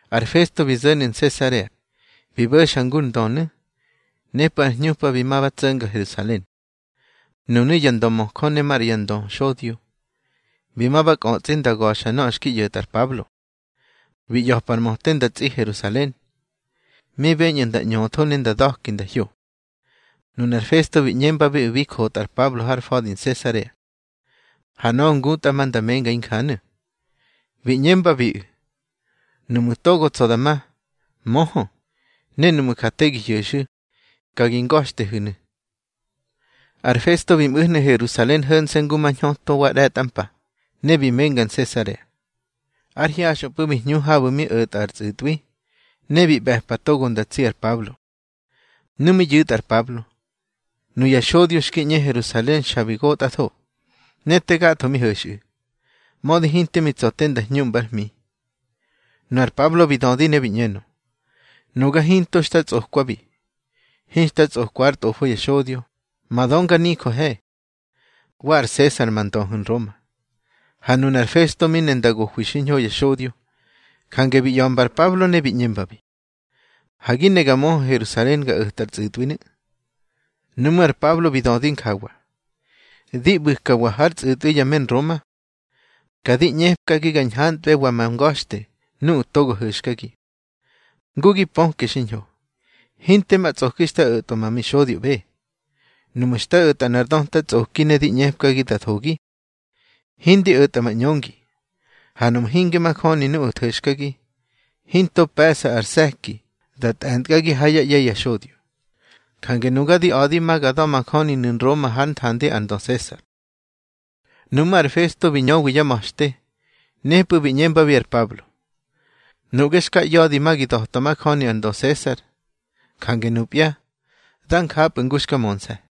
Ar Festo bi zo̱nu̱ Nsesarea, bi bo̱xa ngur ndönu̱. Nepꞌu̱ ár hñupa bi ma ba tso̱nga Herusalen. Nunu̱ ya ndömöjö ne maꞌra ya ndöxodyo, bi ma ba kꞌötsꞌi nda ga̱xa nöꞌö xki ꞌyo̱tꞌa ar Pablo. Bi ꞌya̱pa ar möte nda tsꞌi Herusalen, mi beñꞌu̱ nda ꞌñöthó ne nda da̱ki nda hyo. Nunar Festo bi ꞌñembabiꞌu̱ bi jotꞌa ar Pablo har fa̱di Nsesarea, ha nöꞌö ngutꞌa ma nda menga injanu̱. Bi ꞌñembabiꞌu̱: —Nuꞌmu̱ togo tsa̱ da ma, möhö, ne nuꞌmu̱ ja te gi hyo̱xu̱, ka gi nga̱xtehu̱nu̱. Ar Festo bi mꞌu̱hnu̱ Herusalen ho̱nse̱ ngu ma hñöto wa ꞌre̱tꞌa mpa, ne bi menga Nsesarea. Ár hyaxꞌöpꞌu̱ bi hñu habu̱ mi o̱tꞌa ar tsꞌu̱tꞌwi, ne bi ꞌbe̱pa togo nda tsi ar Pablo. Nu mi yu̱tꞌa ar Pablo, nuya xodyo xki ꞌñe Herusalen xa bi gotꞌatho, ne te gatho mi ho̱xꞌu̱, mödi hinte mi tsa̱ nda hñuꞌmbár hmi. Nu ar Pablo bi dödi ne bi ꞌñenö: —Nuga hinto xta tsꞌokwabi. Hinxta tsꞌokwa ár tꞌofo ya xodyo, ma dönganijöhe, wa ar Sesar ma ndöhu̱ Nroma. Ha nunar Festo mi ne nda gohwi xiñho ya xodyo, jange bi ꞌya̱mba ar Pablo ne bi ꞌñembabi: —Ha gi ne ga möhö Herusalen ga o̱tꞌa ar tsꞌu̱tꞌwinu̱. Nuꞌmú̱ ar Pablo bi dödi njawa: —Di ꞌbu̱kwa har tsꞌu̱tꞌwi ya me Nroma, ka di ꞌñepki ga ñhantꞌbewa ma nga̱xte nuꞌu̱ togo ho̱xkagi. Ngu gi pöke xiñho, hinte ma tsꞌoki xta o̱tꞌwa ma mixodyoꞌbe. Nuꞌmu̱ xta o̱tꞌa nꞌar döta tsꞌoki ne di ꞌñepkagi da thogi, hindi o̱tꞌa ma ꞌñöngi. Ha nuꞌmu̱ hinge majöni nuꞌu̱ tho̱xkagi, hinto pe̱ꞌsa ar se̱ki da tꞌe̱ntkagi ha yá ꞌye̱ ya xodyo. Jange nuga di a̱di ma ga da̱majöninu̱ Nroma hár nthandi ar ndö Sesar. Nuꞌmú̱ ar Festo bi ñöwi yá ma̱xte, nepꞌu̱ bi ꞌñembabi ar Pablo: —Nuꞌge xka ꞌya̱di ma gi da̱twa majöni ar ndö Sesar. Jange nupya, dá njapꞌu̱ ngu xka mönse̱.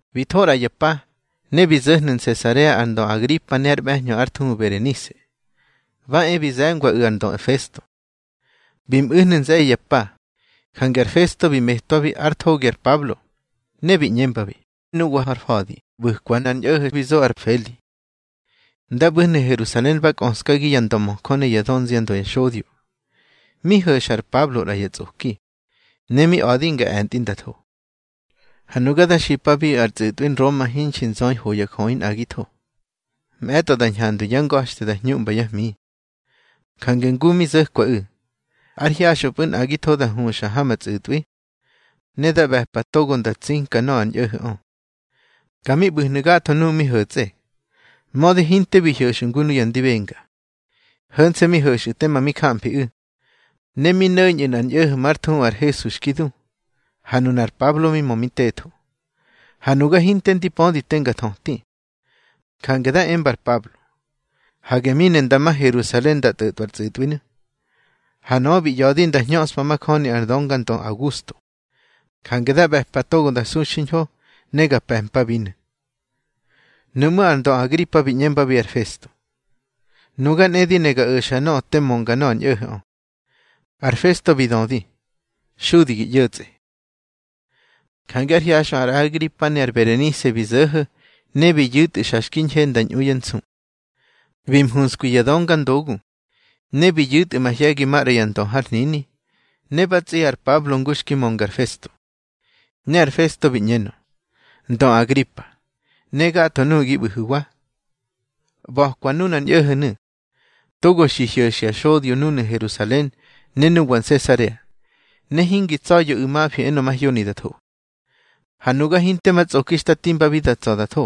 Bi tho ꞌra ya pa, ne bi zo̱hnu̱ Nsesarea ar ndö Agripa ne ár ꞌbe̱hñö ár thuhu Berenise, bá e bi ze̱ngwaꞌu̱ ar ndö Festo. Bi mꞌu̱hnu̱ nze̱ye̱ ya pa, jange ar Festo bi metwabi ár thogi ar Pablo, ne bi ꞌñembabi: —Nuwa har fa̱di ꞌbu̱kwa nꞌar ñꞌo̱ho̱ bi zo ar Feli. Nda ꞌbu̱hnu̱ Herusalen bá kꞌöskagi ya ndömöjö ne yá dönziandö ya xodyo, mi ho̱xa ar Pablo ꞌra ya tsꞌoki, ne mi a̱di nga e̱ntꞌi nda tho. Ha nuga da xipabiꞌu̱ ar tsꞌu̱tꞌwi Nroma hinxi nzöi ho ya jöꞌi nꞌagitho. Mꞌe̱tꞌo da ñhandwi yá nga̱xte da hñuꞌmba yá hmi. Jange ngu mi zo̱kwaꞌu̱, ár hyaxꞌöpꞌu̱ nꞌagitho da huxa ha ma tsꞌu̱tꞌwi, ne da ꞌbe̱pa togo nda tsinka nöꞌö ar ñꞌo̱ho̱ꞌö. Ka mi ꞌbu̱hnu̱ gatho nuꞌu̱ mi ho̱tsꞌe, mödi hinte bi hyo̱xꞌu̱ ngu nuya ndi benga. Ho̱nse̱ mi ho̱xꞌu̱ tema mi jamfiꞌu̱, ne mi no̱ñꞌu̱ nꞌar ñꞌo̱ho̱ már thuhu ar Hesu xki du, ha nunar Pablo mi mö mi tetho. Ha nuga hinte ndi pödi te nga thöti, jange da emba ar Pablo, hage mi ne nda ma Herusalen nda tꞌo̱tꞌwa ar tsꞌu̱tꞌwinu̱. Ha nöꞌö bi ꞌya̱di nda hñöꞌspa majöni ar döngandö Augusto. Jange da ꞌbe̱pa togo da su xiñho ne ga pe̱mpabinu̱. Nuꞌmú̱ ar ndö Agripa bi ꞌñembabi ar Festo: —Nuga nꞌe di ne ga o̱xa nöꞌö te mönga nöꞌö ar ñꞌo̱ho̱ꞌö. Ar Festo bi dödi: —Xudi gi ꞌyo̱tsꞌe. Jange ár hyaxꞌö ar Agripa ne ar Berenise bi zo̱ho̱ ne bi yu̱tꞌu̱ xa xki ñhe nda ñꞌu yá nsu. Bi mhuskwi ya döngandogu, ne bi yu̱tꞌu̱ mahye̱gi maꞌra ya ndö har hnini. Ne ba tsꞌi ar Pablo ngu xki mönga ar Festo. Ne ar Festo bi ꞌñenö: —Ndö Agripa, ne gatho nuꞌu̱ gi ꞌbu̱hu̱wa. ꞌBa̱kwa nunar ñꞌo̱ho̱nu̱, togo xi hyo̱xya xodyo núnu̱ Herusalen ne nuwa Nsesarea, ne hingi tsa̱ya̱ꞌu̱ mafi enö mahyoni da tho. Ha nuga hinte ma tsꞌoki xta timbabi da tsa̱ da tho.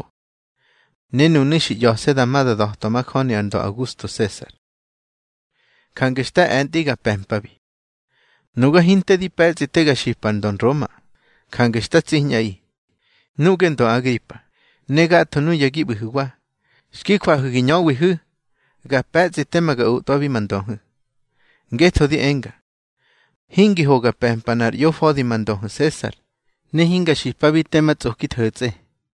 Ne nunu̱ xi ꞌya̱se̱ da ma da da̱twa majöni ar ndö Augusto Sesar, jange xta e̱ntꞌi ga pe̱mpabi. Nuga hinte di pe̱tsꞌi te ga xipa ar ndö Nroma. Jange xta tsiñꞌaꞌi, nuꞌge ndö Agripa, ne gatho nuya gi ꞌbu̱hu̱wa, xki jwahu̱ gi ñöwihu̱, ga pe̱tsꞌi tema ga otꞌwabi ma ndöhu̱. Ngetho di enga, hingi ho ga pe̱mpa nꞌar ꞌyofa̱di ma ndöhu̱ Sesar, ne hinga xipabi tema tsꞌoki tho̱tsꞌe.